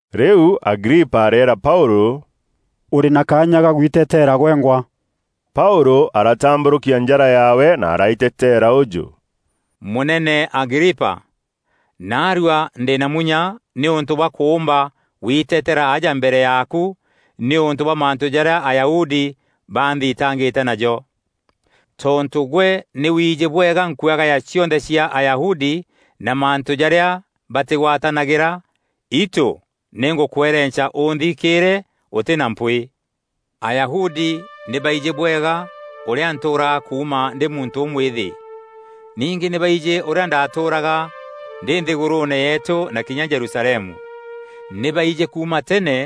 Rîu Agripa areera Paûlû, “Ûrî na kaanya ka gwitetera gwengwa.” Paûlû aratambûrûkia njara yaawe na araiteteera ûjû: “Mûnene Agripa, naarua ndî na munya nîûntû bwa kûûmba gwiteteera aja mbere yaaku, nîûntû bwa mantû jarîa Ayahudi banthitangîte najo. Tontû gwe nî wiijî bwega nkuagaya cionthe cia Ayahudi na mantû jarîa batîgwatanagîra, itû nî ngûkwerenca ûnthikîîre ûtî na mpwîî. “Ayahudi nî baijî bwega ûrîa ntûûraga kuuma ndî muntû ûmwîthî. Ningî nî baijî ûrîa ndaatûûraga ndî nthîgûrûûne yeetû na kinya Jerusalemu. Nî baijî kuuma tene,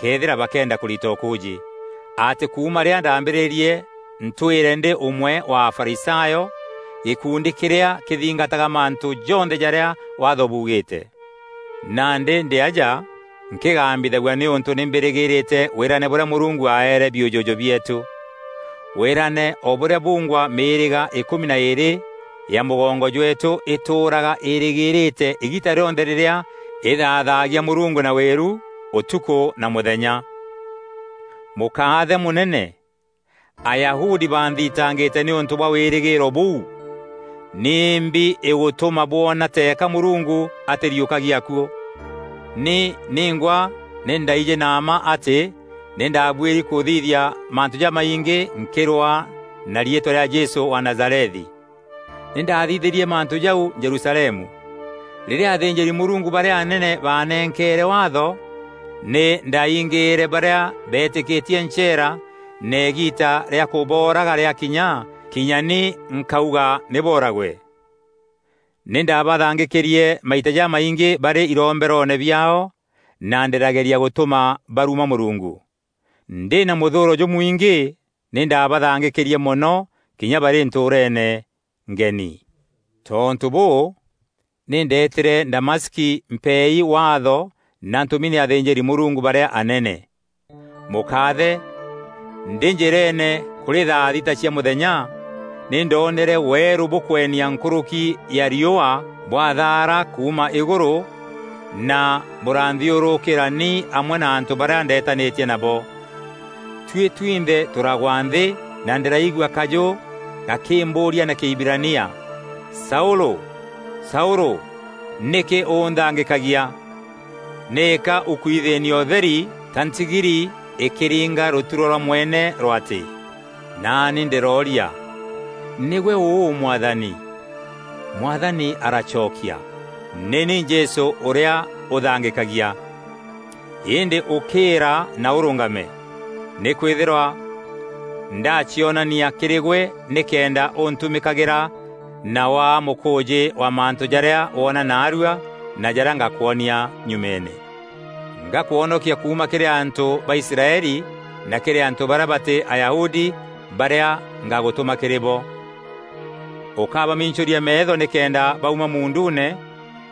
këethîra bakeenda kûrita ûkûûjî, atî kuuma rîrîa ndaambîrîrie ntwîre ndî ûmwe wa Afarisayo, gîkundi kîrîa kîthingataga mantû jonthe jarîa Waatho buugîîte. Nandî ndî aja nkîgambithagua nîûntû nî mbîrîgîîrîte wîrane bûrîa Mûrungu aeere biûjûjû bieetû. Wîrane o bûrîa bungwa mîîrîga îkûmi na îîrî ya mûgongo jweetû îtûûraga îîrîgîrîte îgiita rîonthe rîrîa îthaathagia Mûrungu na wîru, ûtukû na mûthenya. Mûkaathe mûnene, Ayahudi banthitangîte nîûntû bwa wîrîgîîro bûu! Nîmbi îgûtûma bwona teeka Mûrungu atîriûkagia akuû? Ni ningwa nî ndaaijî na mma atî nî ndaabuîri kûthithia mantû jamaingî nkîrwaa na riîtwa rîa Jesû wa Nazarethi. Nî ndaathithîrie mantû jau Jerusalemu. Rîrîa athînjîri-Mûrungu barîa anene baanenkeere Waatho, nî ndaingîîre barîa beetîkîtie ncheera na îgiita rîa kûbooraga rîakinya, kinya ni nkauga nî booragwe. Nî ndabathangîkîrie maita jamaingî barî iromberoone biaao na ndîrageria gûtûma baruma Mûrungu. Ndî na mûthûûro jûmwîngî, nî ndaabanthangîkîrie mono kinya barî ntûûreene ngeni. “Tontû bûû, nî ndeetîre Damaski mpeei waatho na ntûmi nî athînjîri-Mûrungu barîa anene. Mûkaathe, ndî njîreene kûrî thaa thita cia mûthenya, nî ndoonere weerû bûkwenia nkûrûki ya riûa bwathaara kuuma îgûrû na bûranthiûrûkîra ni amwe na antû barîa ndeetanîtie nabo. Tuî twinthe tûragwa nthî na ndîraigua kajû gakîmbûûria na Kîhibirania, ‘Saûlû, Saûlû! Nîkî ûnthangîkagia? Nîka ûkwithîînia ûtheri ta ntigiri îkîringa rûturo rwa mwene rwatî.’ Naani ndîrooria, ‘Nîgwe ûu Mwathani?’ Mwathani aracokia, ‘Nî ni Jesû ûrîa ûthangîkagia. Îndî ûkîîra na ûrûngame. Nîkwîthîrwa ndacionania kîrî gwe nîkenda ûntumîkagîra na waa mûkûûjî wa mantû jarîa woona naarua na jarîa ngakwonia nyumeene. Ngakwonokia kuuma kîrî antû ba Israeli na kîrî antû barîa batî Ayahudi, barîa ngagûtûma kîrî bo. Ûkabamincûria meetho nîkenda bauma muunduune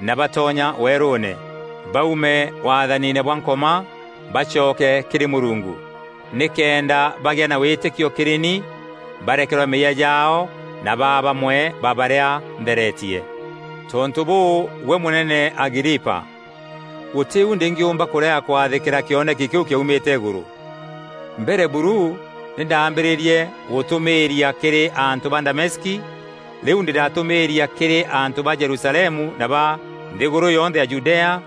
na batonya weerûûne; baume waathaniine bwa Nkoma, bacoke kîrî Mûrungu; nîkenda baagea na wîtîkio kîrî ni, barekerwa meeyia jaao na baa bamwe ba barîa ntheretie.’ “Tontû bûû, gwe mûnene Agripa, gûtî u ndîngîûmba kûrega kwathîkîra kîoneki kîu kîaumîte îgûrû. Mbere buru nî ndaambîrîîrie gûtûmîîria kîrî antû ba Damaski, rîu ndîratûmîîria kîrî antû ba Jerusalemu na ba nthîgûrû yonthe ya Judea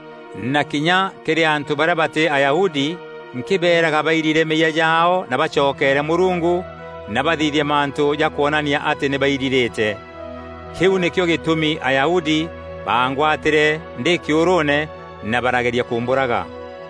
na kinya kîrî antû barîa batî Ayahudi nkîbeeraga bairire meeyia jaao na bacokeere Mûrungu na bathithie mantû ja kwonania atî nî bairirîte. Kîu nîkîo gîtûmi Ayahudi baangwatîre ndî kîûrûûne na barageria kûmbûraga.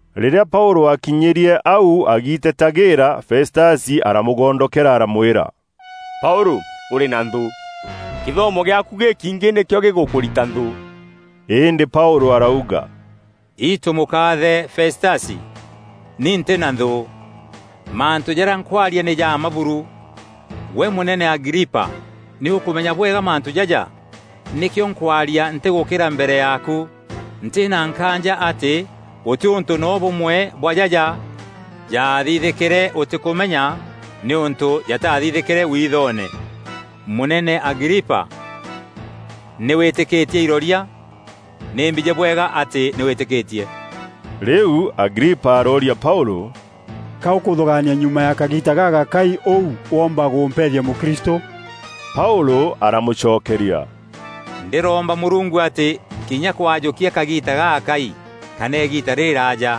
Rîrîa Paûlû akinyîrie au agiitetagîîra, Festasi aramûgondokera aramwîra, “Paûlû, ûrî na nthû! Kîthomo gîaaku gîkiingî nîkîo gîgûkûrita nthû.” Îndî Paûlû arauga, “Itû mûkaathe Festasi, ni ntî na nthû. Mantû jarîa nkwaria nî ja mma buru. Gwe mûnene Agripa nî ûkûmenya bwega mantû jaja, nîkîo nkwaria ntîgûkîra mbere yaaku. Ntî na nkaanja atî gûtî ûntû noo bûmwe bwa jaja jaathithîkîre ûtîkûmenya nîûntû jataathithîkîre withoone. Mûnene Agripa, nî wîtîkîtie iroria? Nî mbijî bwega atî nî wîtîkîtie.” Rîu Agripa arooria Paûlû, “Ka ûkûthûgaania nyuma ya kagiita gagakai ûu woomba gûmpethia mûkristû?” Paûlû aramûcokeria, “Ndîromba Mûrungu atî kinya kwajûkia kagiita gagakai kana îgiita rîrîraaja,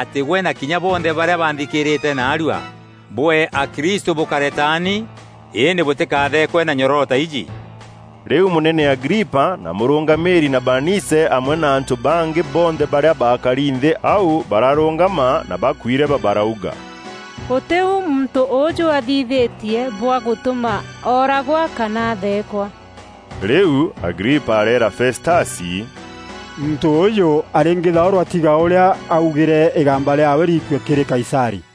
atî gwe na kinya bonthe barîa banthikîîrîte naarua, bûee akristû bûkare taani, îndî bûtîkatheekwe na nyororo ta iji.” Rîu mûnene Agripa, na mûrûngamîîri na Baanice amwe na antû bangî bonthe barîa baakari nthî au bararûngama na bakuireba barauga, “Gûtî u muntû ûûjû athithîtie bwa gûtûma ooragwa kana atheekwa.” Rîu Agripa areera Festasi, “Muntû ûûjû arîngîthaûrwa tiga ûrîa aaugîre îgamba rîaawe riikue kîrî Kaisarî.”